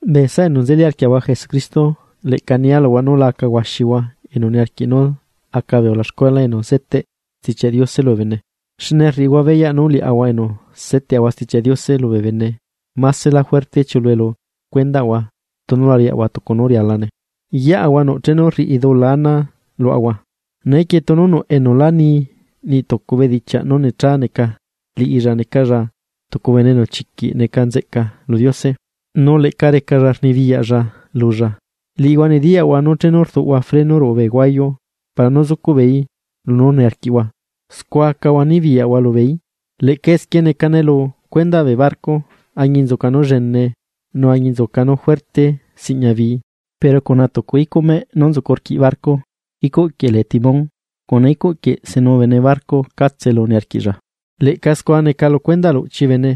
Bee saꞌa enu nzeli arquiaꞌahua Jesucristo, leꞌca nia luhua nú la aca huaxihua enu niarquiꞌ nú aca bee ulaxcuela enu zeteꞌ Stichiaꞌ Diose lubee bene, xne rriꞌihua beyaꞌ nú liaꞌahua enu seteꞌahua Stichiaꞌ Diose lubee bene másela juerte chiuꞌulue lu cuendaꞌahua tunu la riaꞌahua tucu nú rialane. Yeꞌahua nuꞌ chenu rriꞌi dula ana luaꞌahua, neequie tunu nuꞌ enu lá ni niꞌ tucu bedichiaꞌ nú necha neca liꞌilla necalla tucu bene enu chiquiꞌ neca nzeꞌca lu Diose, nu leꞌca recalla rnibiyaꞌlla lulla. Liꞌihua nediyaꞌhua nú chenu rduꞌahua freno ruꞌu bee huayu para nú zucuꞌ beeí lunú niarquiaꞌahua, scua acaꞌahua nibiyaꞌahua lubeeí. Leꞌca esquie necane lu cuendaꞌ bee barco, añinzuca nú llenee nu añinzuca nú juerte siꞌña bii, pero cuna tucu icuꞌ meꞌ nú nzucu rquiꞌ barco, icuꞌ quieꞌ lee timón, cuna icuꞌ quieꞌ senu bene barco catse elu niarquiꞌlla. Leꞌca scua neca lu cuendaꞌ luꞌchi bene,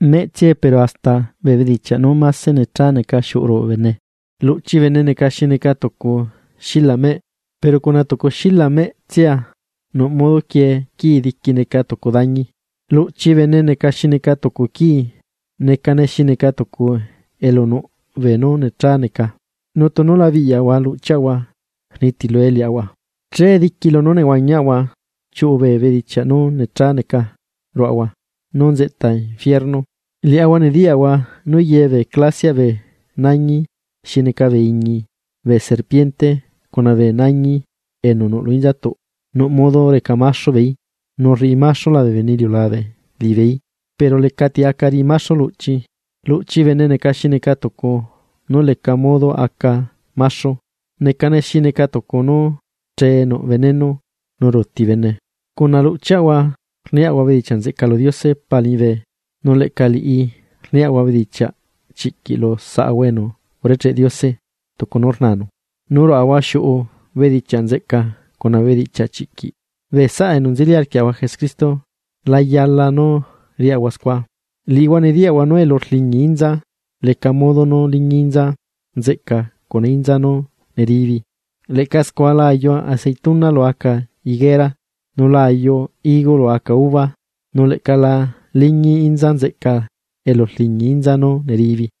meꞌtsiae pero hasta bee bedichiaꞌ nú máse necha neca xiuꞌu ruꞌu bene. Luꞌchi bene neca xi neca tucu xila meꞌ, pero cuna tucu xila meꞌtsia nuꞌmodo quiee quii diqui neca tucu dañi. Luꞌchi bene neca xi neca tucu quii, necane xi neca tucu elu nuꞌ bee nú necha neca, nu tunu la biꞌyaꞌahua luꞌchiaꞌahua rnitilue liaꞌahua, che diqui lunú nehuañiaꞌahua chiuꞌu bee bedichiaꞌ nú necha neca ruaꞌahua nú nzeꞌta ebila. Liaꞌahua nediyaꞌahua nú ye clasiaꞌ bee nañi xi neca bee iñi, bee serpiente, cuna bee nañi enu nuꞌ lu inzatuꞌ nuꞌ modo reca maxu beeí, nu rriꞌi maxula bene iliulabe beeí. Pero lecati aca riꞌi maxu luꞌchi. Luꞌchi bene neca xi neca tucu nú leca modo aca maxu, necane xi neca tucu nú chee nuꞌ veneno nú ruuti bene. Cuna luꞌchiaꞌahua rniaꞌahua bedichiaꞌ nzeꞌca lu Diose Pa liñibe, nu leꞌca liꞌi rniaꞌahua bedichiaꞌ chiꞌquiꞌ lu saꞌahua enu urecheꞌ Diose tucu nú rnanu. Nu ruꞌahua xiuꞌu bedichiaꞌ nzeꞌca cuna bee bedichiaꞌ chiꞌquiꞌ, bee saꞌa enu nzeli arquiaꞌahua Jesucristo, la yala nú riaꞌahua scua. Liꞌihua nediyaꞌhua nú elu rliñi inza, leca modo nú liñi inza nzeꞌca cuna inza nú neribi. Leꞌca scua la ayu aceituna lu aca higuera, nu la ayu higo lu aca uva, nu leꞌca la liñi inza nzeꞌca elu rliñi inza nú neribi.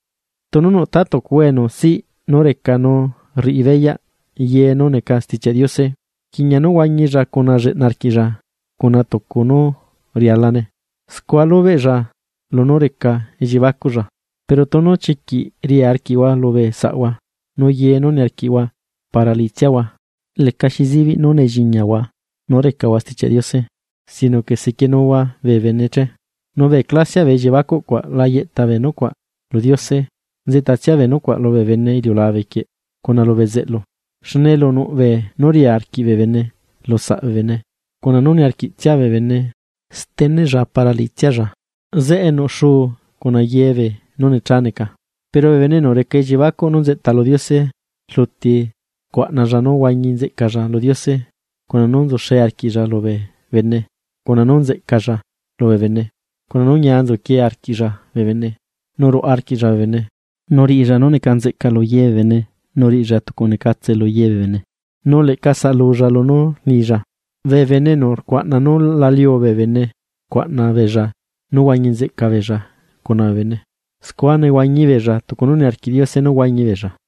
Tunu nuꞌ tatucuhua enu siꞌ nú reca nu rriꞌi beyaꞌ ye nú neca Stichiaꞌ Diose, rquiꞌña nú aca lleꞌna arquiꞌlla tucu nu rialane, scua lubeꞌlla lunú reca elliebacuꞌlla. Pero tunu chiquiꞌ ria arquiꞌhua lubee saꞌhua nu ye nú niarquiꞌhua para liꞌitsiahua, lecaxi zibiꞌ nú nelliñahua nú recahua Stichiaꞌ Diose, sino que sequienuhua bee bene che. Nu bee clasiaꞌ bee elliebacuꞌ cuaꞌ la yeꞌta bee nucuaꞌ lu Diose, nzeꞌtatsia bee nucuaꞌ lubee bene iliulabe quieꞌ, cuna lu bezeꞌlu. Xne elu nuꞌ beenú ria arquiꞌ bee bene lusaꞌ bene cuna nú niarquiꞌtsia bee bene steneꞌlla para liꞌitsialla, zeꞌe nuꞌ xuu cuna ye beenú necha neca. Pero bee bene enu reca elliebacuꞌ nú nzeꞌta lu Diose, rluti rcuaꞌnalla nú huañi nzeꞌcalla lu Diose, cuna nú nzuxe arquiꞌlla lubee bene, cuna nú nzeꞌcalla lubee bene, cuna nú ñia nzuquie arquiꞌlla bee bene, nu ruaꞌa arquiꞌlla bee bene, nu rriꞌilla nú neca nzeꞌca lu ye bee bene, nu riꞌilla tucu necatse lu ye bee bene. Nu leꞌca saꞌalulla lunú rrnilla. Bee bene enu rcuaꞌna nú la liu bee bene rcuaꞌna beella nú huañi nzeꞌca beella cuna bee bene, scua nehuañi beella tucu nú niarquiꞌ Diose nú huañi beella.